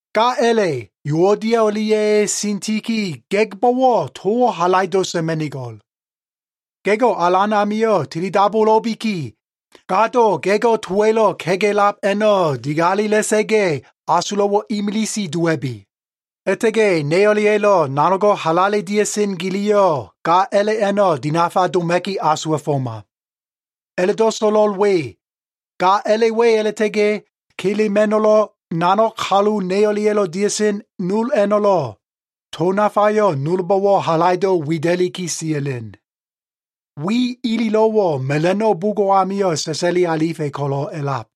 Ga a꞉la꞉ Yuodia o꞉lia꞉ Sitika꞉ ga꞉gbo꞉wo꞉ towo꞉ halaido꞉ sa꞉ma꞉nigo꞉l. Ga꞉go꞉ Alan amio꞉ tilidabulo꞉biki, gado ga꞉go꞉ towa꞉lo꞉ kega꞉lab a꞉no꞉ digalela꞉sa꞉ga꞉, asulo꞉wo꞉ imilise dowa꞉bi. A꞉la꞉ta꞉ga꞉ ne o꞉lia꞉lo꞉ nanogo꞉ halale dia꞉sen giliyo꞉, ga a꞉la꞉ a꞉no꞉ dinafa doma꞉ki asuwa꞉foma. A꞉la꞉do꞉ so꞉lo꞉l we, ga a꞉la꞉ we a꞉la꞉ta꞉ga꞉ Kla꞉ma꞉no꞉lo꞉, nanog kalu ne o꞉lia꞉lo꞉ dia꞉sen nol a꞉no꞉lo꞉, to nafayo꞉ nolbo꞉wo꞉ halaido꞉ wida꞉liki sia꞉len. Wi ililo꞉wo꞉ mela꞉no꞉ bugo꞉ amio꞉ sa꞉sa꞉li alifa꞉ ko꞉lo꞉ a꞉lab.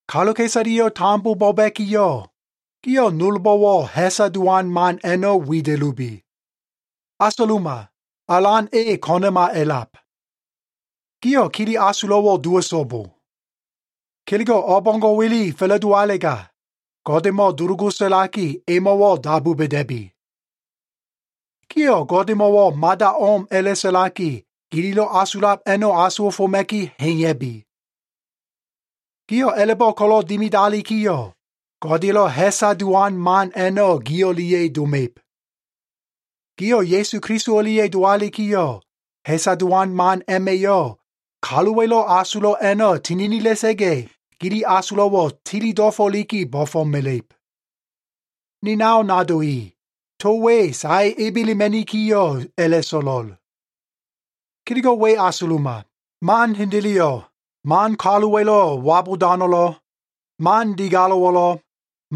Kaluka꞉isaleyo꞉ tambo bo꞉ba꞉kiyo꞉, gio꞉ nolbo꞉wo꞉ ha꞉sa dowan man a꞉no꞉ wida꞉lubi. Asuluma, Alan e ko꞉na꞉ma a꞉lab. Gio꞉ kele asulo꞉wo꞉ dowa꞉so꞉bo. Kelego꞉ o꞉bo꞉ngo꞉wa꞉le fa꞉la꞉dowalega, Godemo꞉ dulugu sa꞉laki, emo꞉wo꞉ dabu ba꞉da꞉bi. Gio꞉ Godemo꞉wo꞉ mada o꞉m a꞉la꞉sa꞉laki, gililo꞉ asulab a꞉no꞉ asuwa꞉foma꞉ki ha꞉iya꞉bi. Gio꞉ a꞉la꞉bo꞉ ko꞉lo꞉ dimidalikiyo꞉, Godeya꞉lo꞉ ha꞉sa dowan man a꞉no꞉ gi o꞉lia꞉ doma꞉ib. Gio꞉ Ya꞉su Keliso o꞉lia꞉ dowalikiyo꞉, ha꞉sa dowan man a꞉ma꞉yo꞉ kaluwa꞉lo꞉ asulo꞉ a꞉no꞉ tininila꞉sa꞉ga꞉, gili asulo꞉wo꞉ tili dofo꞉liki bo꞉fo꞉mela꞉ib. Ni nao nado i, to we sae ebelema꞉nikiyo꞉ a꞉la꞉so꞉lo꞉l. Kelego꞉ we asuluma. Man hendeleyo꞉, man kaluwa꞉lo꞉ wabudano꞉lo꞉, man digalo꞉wo꞉lo꞉,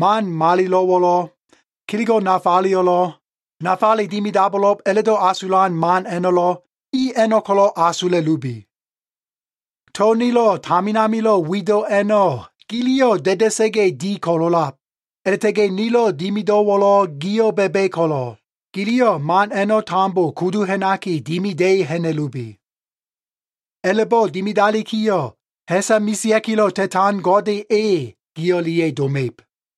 man malilo꞉wo꞉lo꞉, kelego꞉ nafaleyo꞉lo꞉, nafale dimidabo꞉lo꞉b a꞉la꞉do꞉ asulan man a꞉no꞉lo꞉, i a꞉no꞉ ko꞉lo꞉ asula꞉lubi. To nilo꞉ tamin amilo꞉ wido꞉ a꞉no꞉ giliyo꞉ da꞉da꞉sa꞉ga꞉ di ko꞉lo꞉lab, a꞉la꞉ta꞉ga꞉ nilo꞉ dimido꞉wo꞉lo꞉ gio꞉ ba꞉ba꞉ ko꞉lo꞉, giliyo꞉ man a꞉no꞉ tambo kudu ha꞉naki, dimida꞉i ha꞉na꞉lubi. A꞉la꞉bo꞉ dimidalikiyo꞉, ha꞉sa mesea꞉kilo꞉ ta꞉tan Gode e, gi o꞉lia꞉ doma꞉ib.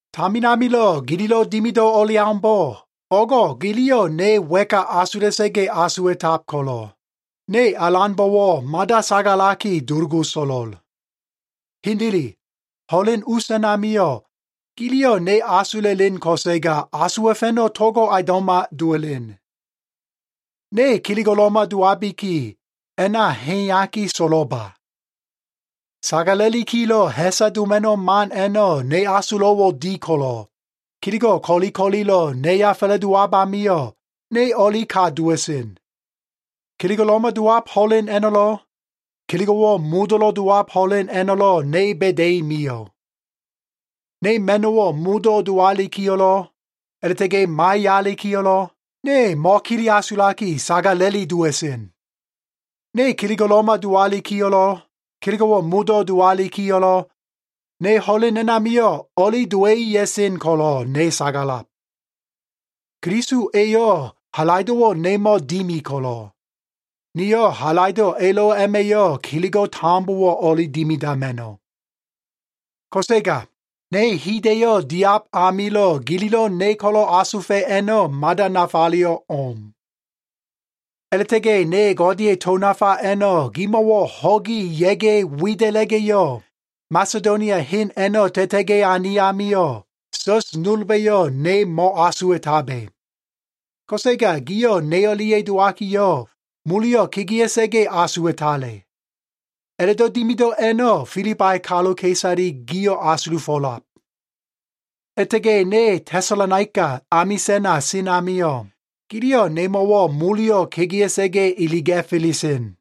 Tamin amilo꞉ gililo꞉ dimido꞉ o꞉leaumbo꞉, o꞉go꞉ giliyo꞉ ne wa꞉ka asula꞉sa꞉ga꞉ asuwa꞉tab ko꞉lo꞉, ne Alanbo꞉wo꞉ mada sagalaki dulugu so꞉lo꞉l. Hendele, ho꞉len us a꞉namio꞉, giliyo꞉ ne asula꞉len ko꞉sega asuwa꞉fa꞉no꞉ togo꞉ aundo꞉ma dowa꞉len. Ne kelego꞉lo꞉ma dowabiki, a꞉na ha꞉iyaki so꞉lo꞉ba. Sagala꞉likilo꞉ ha꞉sa doma꞉no꞉ man a꞉no꞉ ne asulo꞉wo꞉ di ko꞉lo꞉, kelego꞉ ko꞉li ko꞉lilo꞉ neya fa꞉la꞉dowab amio꞉, ne o꞉lika dowa꞉sen. Kelego꞉lo꞉ma dowab ho꞉len a꞉no꞉lo꞉, kelego꞉wo꞉ modo꞉lo꞉ dowab ho꞉len a꞉no꞉lo꞉ ne ba꞉da꞉i mio꞉. Ne ma꞉no꞉wo꞉ modo꞉ dowalikiyo꞉lo꞉ a꞉la꞉ta꞉ga꞉ maiyalikiyo꞉lo꞉, ne mo꞉kele asulaki, sagala꞉li dowa꞉sen. Ne kelego꞉lo꞉ma dowalikiyo꞉lo꞉, kelego꞉wo꞉ modo꞉ dowalikiyo꞉lo꞉, ne ho꞉len a꞉namio꞉ o꞉li dowa꞉i ya꞉sen ko꞉lo꞉ ne sagalab. Keliso eyo꞉ halaido꞉wo꞉ nemo꞉ dimi ko꞉lo꞉, niyo꞉ halaido꞉ elo꞉ a꞉ma꞉yo꞉ kelego꞉ tambowo꞉ o꞉li dimidama꞉no꞉. Ko꞉sega ne hida꞉yo꞉ diab amilo꞉ gililo꞉ ne ko꞉lo꞉ asufa꞉ a꞉no꞉ mada nafayo꞉ o꞉m. A꞉la꞉ta꞉ga꞉ ne Godeya꞉ to nafa a꞉no꞉ gimo꞉wo꞉ ho꞉gi ya꞉ga꞉ wida꞉la꞉ga꞉yo꞉, Masedonia hen a꞉no꞉ ta꞉ta꞉ga꞉ ane amio꞉, sa꞉s nolba꞉yo꞉ ne mo꞉asuwa꞉tabe. Ko꞉sega gio꞉ ne o꞉lia꞉ dowakiyo꞉, moleyo꞉ kegea꞉sa꞉ga꞉ asuwa꞉tale. A꞉la꞉do꞉ dimido꞉ a꞉no꞉ Filibai kaluka꞉isale gio꞉ asulufo꞉lab. A꞉la꞉ta꞉ga꞉ ne Tesalonaika amisa꞉na sen amio꞉, giliyo꞉ nemo꞉wo꞉ moleyo꞉ kegea꞉sa꞉ga꞉ iliga꞉fela꞉sen.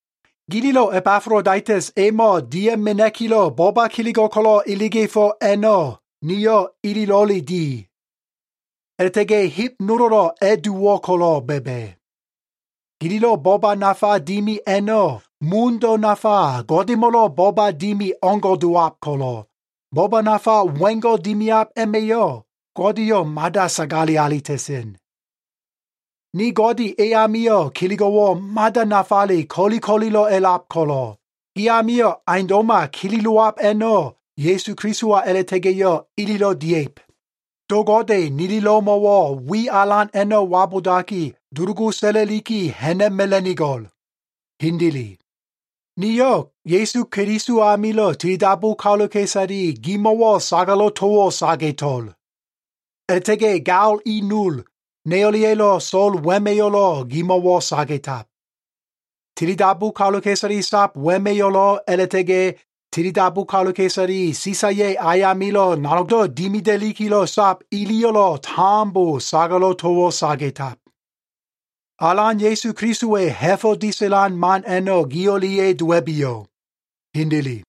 Gililo꞉ Ebafolodaitas emo꞉ dia꞉ mena꞉kilo꞉ boba kelego꞉ ko꞉lo꞉ iliga꞉fo꞉ a꞉no꞉ niyo꞉ ililo꞉le di. A꞉la꞉ta꞉ga꞉ heb nolo꞉lo꞉ a꞉dowo꞉ ko꞉lo꞉ ba꞉ba꞉. Gililo꞉ boba nafa dimi a꞉no꞉ mundo꞉ nafa Godemo꞉lo꞉ boba dimi o꞉ngo꞉ dowab ko꞉lo꞉, boba nafa wengo꞉ dimiab a꞉ma꞉yo꞉ Godeyo꞉ mada sagale alita꞉sen. Ni Gode e amio꞉ kelego꞉wo꞉ mada nafale ko꞉li ko꞉lilo꞉ a꞉lab ko꞉lo꞉, gi amio꞉ aundo꞉ma kelelowab a꞉no꞉ Ya꞉su Kelisowa a꞉la꞉ta꞉ga꞉yo꞉ ililo꞉ dia꞉ib. Do Gode nililo꞉mo꞉wo꞉ wi alan a꞉no꞉ wabudaki, dulugu sa꞉la꞉liki ha꞉na꞉mela꞉nigo꞉l. Hendele. Niyo꞉ Ya꞉su Keliso amilo꞉ tilidabu kaluka꞉isale gimo꞉wo꞉ sagalo꞉ towo꞉ saga꞉to꞉l. A꞉la꞉ta꞉ga꞉ gao i nol, ne o꞉lia꞉lo꞉ so꞉l wema꞉yo꞉lo꞉ gimo꞉wo꞉ saga꞉tab. Tilidabu kaluka꞉isale sab wema꞉yo꞉lo꞉ a꞉la꞉ta꞉ga꞉ tilidabu kaluka꞉isale Sisaya꞉ ayamilo꞉ nanogdo꞉ dimida꞉likilo꞉ sab iliyo꞉lo꞉ tambo sagalo꞉ towo꞉ saga꞉tab. Alan Ya꞉su Kelisowa꞉ ha꞉fo꞉ disa꞉lan man a꞉no꞉ gi o꞉lia꞉ dowa꞉biyo꞉. Hendele.